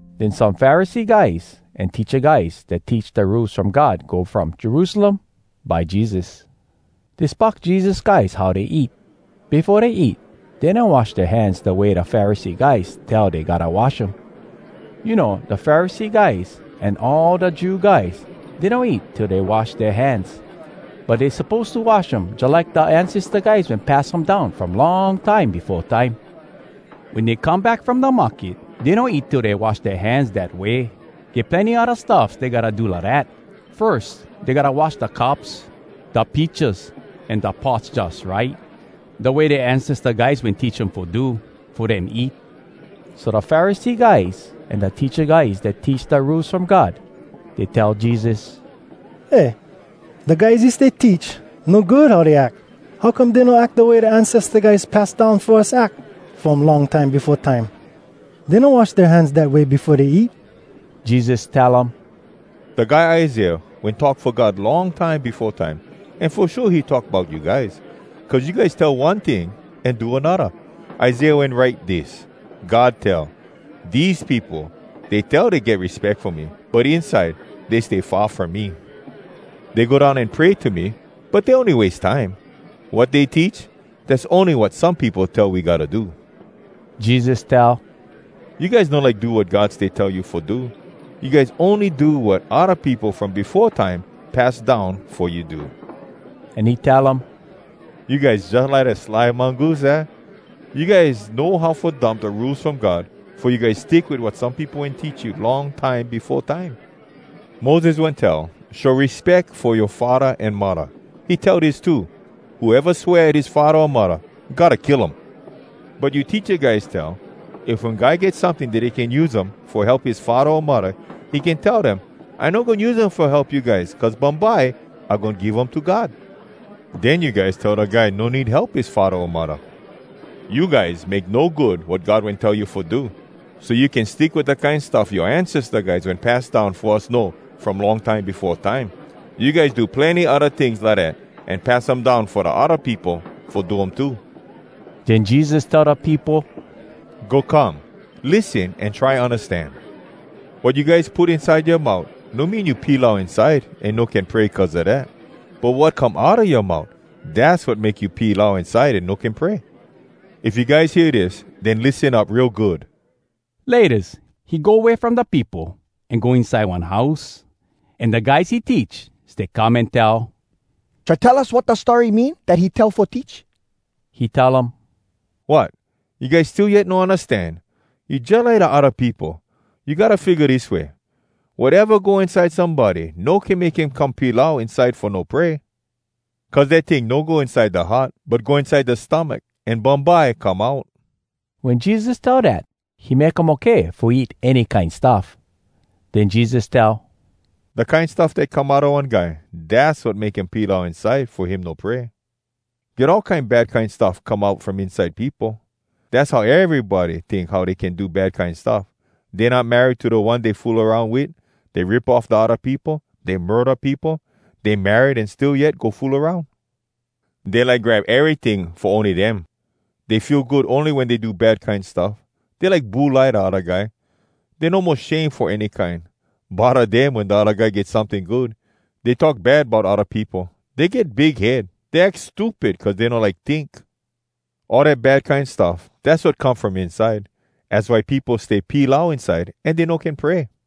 Den some Pharisee guys an teacha guys dat teach da Rules From God go from Jerusalem by Jesus. Dey spock Jesus guys how dey eat. Befo dey eat, dey no wash dea hands da way da Pharisee guys tell dey gotta wash um. You know, da Pharisee guys an all da Jew guys, dey no eat till dey wash dea hands. But dey suppose to wash um jalike da ancesta guys wen pass um down from long time befo time. Wen dey come back from da market, dey no eat till dey wash dea hands dat way. Get plenny odda stuffs dey gotta do lidat. Firs, dey gotta wash da cups, da pitchas, an da pots jus right, da way dea ancesta guys wen teach um fo do, fo dem eat. So da Pharisee guys an da teacha guys dat teach da Rules From God, dey tell Jesus, “Eh, da guys you stay teach, no good how dey ack! How come dey no ack da way da ancesta guys pass down fo us ack from long time befo time? Dey no wash dea hands dat way befo dey eat!” Jesus tell um, “Da guy Isaiah wen talk fo God long time befo time, an fo shua he talk bout you guys! Cuz you guys tell one ting an do anodda. Isaiah wen write dis: “‘God tell: Dese peopo, dey tell dey get respeck fo me, But inside dey stay far from me. Dey go down an pray to me, But dey ony wase time. Wat dey teach, Dass ony wat some peopo tell we gotta do.’” Jesus tell, “You guys no like do wat God stay tell you fo do. You guys ony do wat odda peopo from befo time pass down fo you do.” An he tell um, “You guys jalike da sly mongoose, aah?! You guys know how fo dump da Rules From God, fo you guys stick wit wat some peopo wen teach you long time befo time. Moses wen tell, ‘Show respeck fo yoa faddah an muddah.’ He tell dis too: ‘Whoeva swear at his faddah o muddah, gotta kill him.’ “But you teacha guys tell, ‘If one guy get someting dat he can use um fo help his faddah o muddah, he can tell dem, “I no goin use um fo help you guys, cuz bumbye I goin give um to God.” ’ Den you guys tell da guy no need help his faddah o muddah. You guys make no good wat God wen tell you fo do, so you can stick wit da kine stuff yoa ancesta guys wen pass down fo us know from long time befo time. You guys do plenny odda tings lidat, an pass um down fo da odda peopo fo do um too.” Den Jesus tell da peopo, “Go come. Lissen an try undastan. Wat you guys put inside yoa mout no mean you pilau inside an no can pray cuz a dat. But wat come outa yoa mout, dass wat make you pilau inside an no can pray. If you guys hear dis, den lissen up real good!” Laytas he go way from da peopo, an go inside one house, an da guys he teach stay come an tell, “Try tell us wat da story mean dat he tell fo teach.” He tell um, “Wot! You guys still yet no undastan? You jalike da odda peopo! You gotta figga dis way: Wateva go inside somebody no can make him come pilau inside fo no pray. Cuz dat ting no go inside da heart, but go inside da stomach, an bumbye come out.” (Wen Jesus tell dat, he make um okay fo eat any kine stuff.) Den Jesus tell, “Da kine stuff dat come outa one guy, dass wat make him pilau inside fo him no pray. Get all kine bad kine stuff come out from inside peopo. Dass how erybody tink how dey can do bad kine stuff: dey not married to da one dey fool aroun wit; dey rip off da odda peopo; dey murda peopo; dey married an still yet go fool aroun; dey like grab eryting fo ony dem; dey feel good wen dey do bad kine stuff; dey like bulai da odda guy; dey no mo shame fo any kine; bodda dem wen da odda guy get someting good; dey talk bad bout odda peopo; dey get big head; dey ack stupid cuz dey no like tink. All dat bad kine stuff, dass wat come from inside. Az why peopo stay pilau inside an dey no can pray.”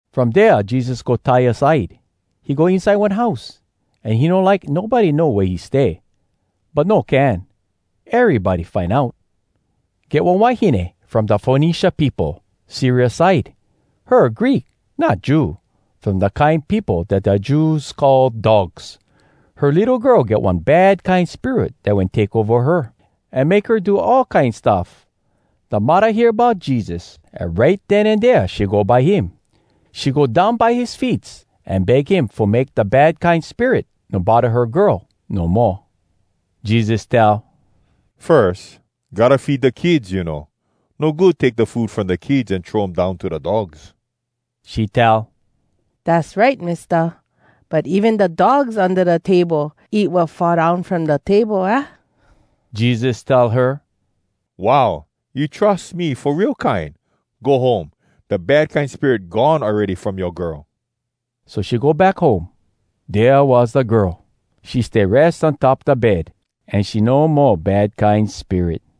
From dea Jesus go Tyre side. He go inside one house, an he no like nobody know wea he stay. But no can. Erybody find out. Get one wahine from da Fonecia peopo, Syria side. Her Greek, not Jew, from da kine peopo dat da Jews call “dogs.” Her litto girl get one bad kine spirit dat wen take ova her, an make her do all kine stuff. Da muddah hear bout Jesus, an right den an dea she go by him. She go down by his feets, an beg him fo make da bad kine spirit no bodda her girl no moa. Jesus tell, “Firs, gotta feed da kids, you know. No good take da food from da kids an throw um down to da dogs.” She tell, “Dass right, Mista. But even da dogs unda da table eat wat fall down from da table, aah?” Jesus tell her, “Wow! You trus me fo real kine! Go home. Da bad kine spirit gone awready from yoa girl!” So she go back home. Dea was da girl. She stay res on top da bed, an she no mo bad kine spirit.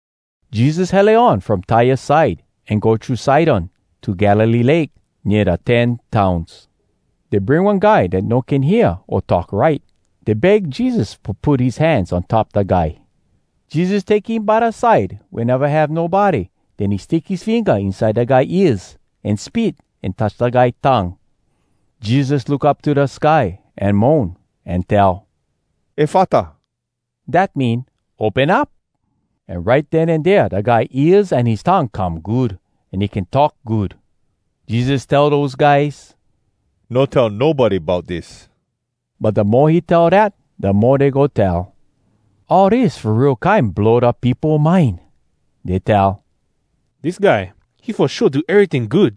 Jesus hele on from Tyre side, an go thru Sidon, to Galilee Lake, nea da Ten Towns. Dey bring one guy dat no can hear o talk right. Dey beg Jesus fo put his hands on top da guy. Jesus take him by da side wea neva have nobody. Den he stick his finga inside da guy ears, an spit, an touch da guy tongue. Jesus look up to da sky, an moan, an tell, “Efata!” Dat mean, “Open up!” An right den an dea da guy ears an his tongue come good, an he can talk good. Jesus tell dose guys, “No tell nobody bout dis!” But da mo he tell dat, da mo dey go tell. All dis fo real kine blow da peopo mind. Dey tell, “Dis guy, he fo shua do eryting good!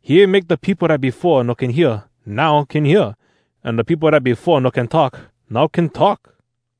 He even make da peopo dat befo no can hear, now can hear, an da peopo dat befo no can talk, now can talk!”